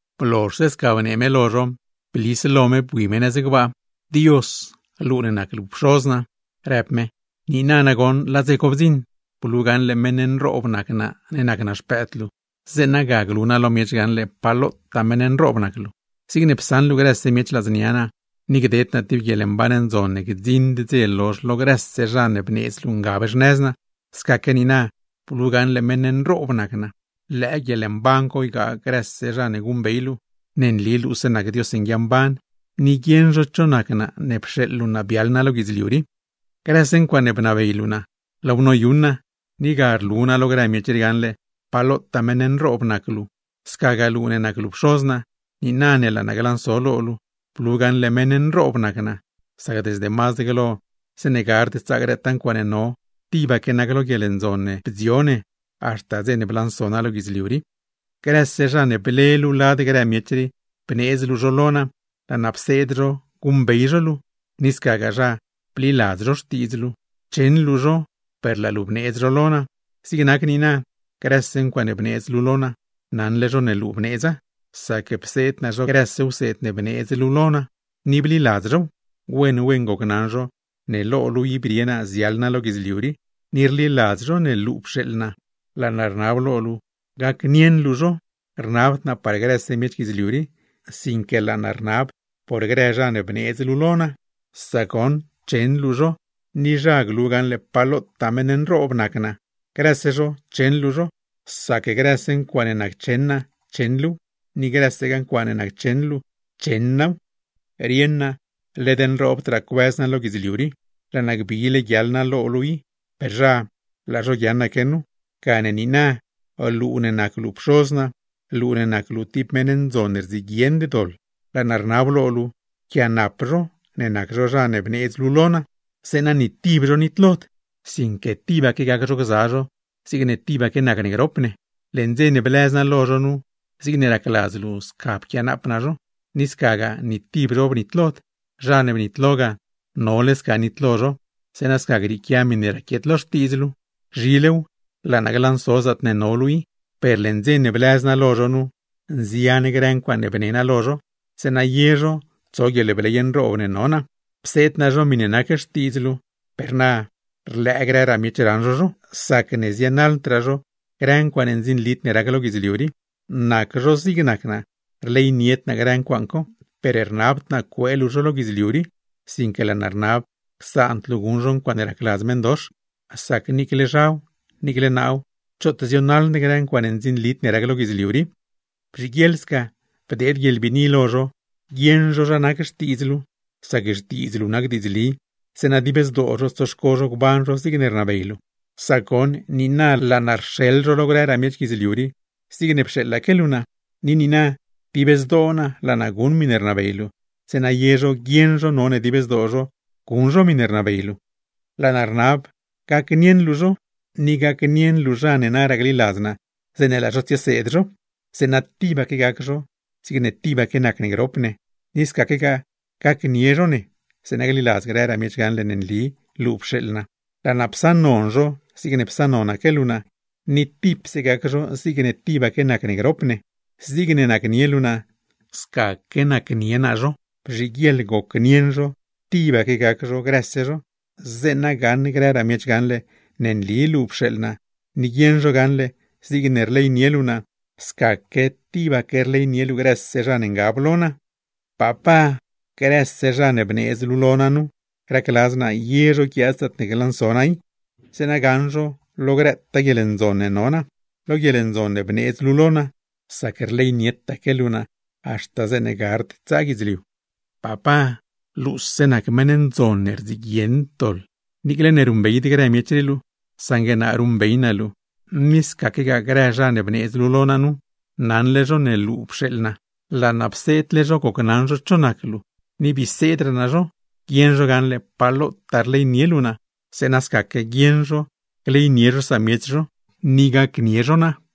Blozhse sca në me lo no, blis lo me bui me nëz gbaa. ―Dios, luu ne nac luu Pxoz naa ―rëb me―, niina nagoṉ laa dze co bdziṉ. Blu gaṉle meṉ nroob nac naa ne nac naa Xpëëd luu, zeeṉa ga glu naa lo miech gaṉle pa lotaa meṉ nroob nac luu. Zigne psaṉ luu grëse miech ladznia naa, ni gdeed naa tib guieḻmban ndzon ne gdziṉd dze lozh lo grëse zha ne bneedz luu ngab xnëz naa; scaque niina blu gaṉle meṉ nroob nac naa. Lëë guieḻmban co ygaa grëse zha ne guṉbey luu, ne nli luuse nac Dios nguia mban, ni guieṉ zho cho nac naa, ne pxeeḻ luu naa biaḻ naa lo guidzliu rii. Grëse ncuaaṉe bnabey luu naa, laaw noyuṉ naa; ni ga rlu naa lo grë miech rii gaṉle pa lotaa meṉ nroob nac luu. Scagaa luu ne nac luu Pxoz naa, niina ne laa naa glanso lo luu, blu gaṉle meṉ nroob nac naa; sac desde mazd glo zeeṉe gard tsaa grëtaa ncuaaṉe no, tibaque nac lo guieḻndzon ne bdzio ne haxta dze ne blanso naa lo guidzliu rii. ’Grëse zha ne ble luu lad grë miech rii bneedz luu lo naa, laa naa pseed zho guṉbey zho luu; ni scagaa zha, bliladz zho xtiidz luu. Cheṉ luu zho per laa luu bneedz zho lo naa. Zig nac niina, grëse ncuaaṉe bneedz luu lo naa, naṉle zho ne luu bneedza, sac pseed naa zho grëse wseed ne bneedz luu lo naa, ni bliladz zhow. Wen wen gocnaṉ zho ne lo luu i brie naa ziaḻ naa lo guidzliu rii, ni rliladz zho ne luu pxeeḻ naa. Laa naa rnab lo luu gacnieṉ luu zho. Rnabd naa par grëse miech guidzliu rii, sinque laa naa rnab por grë zha ne bneedz luu lo naa; sac goṉ cheṉ luu zho, ni zha glu gaṉle pa lotaa meṉ nroob nac naa. Grëse zho cheṉ luu zho; sac grëse ncuaaṉe naccheṉ naa, cheṉ luuw; ni grësegaa ncuaaṉe naccheṉ luu, cheṉ naaw. Rieṉ naa, led nroobdraa cuëz naa lo guidzliu rii, laa naa gbile guiaḻ naa lo luu i; per zha, laa zho guiaaṉaque nu. Gane niina, luu ne nac luu Pxoz naa, luu ne nac luu tib meṉ ne guieṉd xtoḻ, laa naa rnab lo luu: pquianap zho ne nac zho zha ne bneedz luu lo naa, zeeṉa ni tib zho nitlod, sinque tibaque gac zho gza zho zigne tibaque nacne grop ne. Leṉ dze ne blëz naa lo zho nu, zigne racladz luu sca pquianaap naa zho. Ni scagaa ni tib zho bnitlod; zha ne bnitlo ga, nole ne sca nitlo zho, zeeṉa sca grieequia miṉe raquiet lo Xtiidz luu. ’Zhilew laa naa glanso zaatne no luu i; per leṉ dze ne blëz naa lo zho nu, nzian grë ncuaaṉe bne naa lo zho, zeeṉa ye zho tso guieḻbley nroob ne no naa. Pseed naa zho miṉe nac xtiidz luu; per na rlëë grëraa miech raṉ zho zho, sacne zienaḻdraa zho grë ncuaaṉe ndzinlid ne rac lo guidzliu rii. Nac zho zigne nac naa, rleynied naa grë ncuaaṉ co. Per rnabd naa cuee luu zho lo guidzliu rii, sinque laa naa rnab csaand luu guṉ zho ncuaaṉe racladz meṉdox. Sac niicle zhaw, niicle naaw, choot zionaḻd grë ncuaaṉe ndzinlid ne rac lo guidzliu rii. Bzhiguieḻ sca bdeed guieḻbiini lo zho guieṉ zho zha nac Xtiidz luu, sac Xtiidz luu nac diidzli; zeeṉa dib zdoo zho tsoxco zho gban zho zigne rnabey luu. Sac goṉ, niina laa naa rxeḻ zho lo grëraa miech guidzliu rii, zigne ne pxeeḻaque luu naa. Ni niina, dib zdoo naa laa naa guṉ miṉe rnabey luu, zeeṉa ye zho guieṉ zho none dib zdoo zho guṉ zho miṉe rnabey luu. ’Laa naa rnab gacnieṉ luu zho, ni gacnieṉ luu zha ne naraa gliladz naa, zeeṉe laa zho tsieseed zho; zeeṉa tibaque gac zho, zigne tibaque nac ne grop ne. Ni scaquegaa gacnie zho ne, zeeṉa gliladz grëraa miech gaṉle ne nli luu pxeeḻ naa. Laa naa psaṉnon zho zigne psaṉnonaque luu naa, ni tipse gac zho zigne tibaque nac ne grop ne. Zigne nacnie luu naa, scaque nacnie naa zho. Bzhiguieḻ gocnieṉ zho, tibaque gac zho grëse zho, zeeṉa gaṉ grëraa miech gaṉle ne nli luu pxeeḻ naa, ni guieṉ zho gaṉle zigne rleynie luu naa, scaque tibaque rleynie luu grëse zha ne ngab lo naa. Papá, grëse zha ne bneedz luu lo naa nu, racladz naa ye zho guiaad zaatne glanso naa i, zeeṉa gaṉ zho lo grëtaa guieḻndzon ne no naa. Lo guieḻndzon ne bneedz luu lo naa, sac rleynietaque luu naa haxta zeeṉe gard tsaa guidzliu. ’Papá, luuse nac meṉ ne rapd ni tib doḻ, niicle ne ruṉbeyd grë miech rii luu, saṉgue naa ruṉbey naa luu; ni scaquegaa grë zha ne bneedz luu lo naa nu, naṉle zho ne luu pxeeḻ naa. Laa naa pseedle zho gocnaṉ zho cho nac luu ni bii seedragaa naa zho, guieṉ zho gaṉle pa lotaa rleynie luu naa; zeeṉa scaque guieṉ zho gleynie zho samiech zho, ni gacnie zho naa.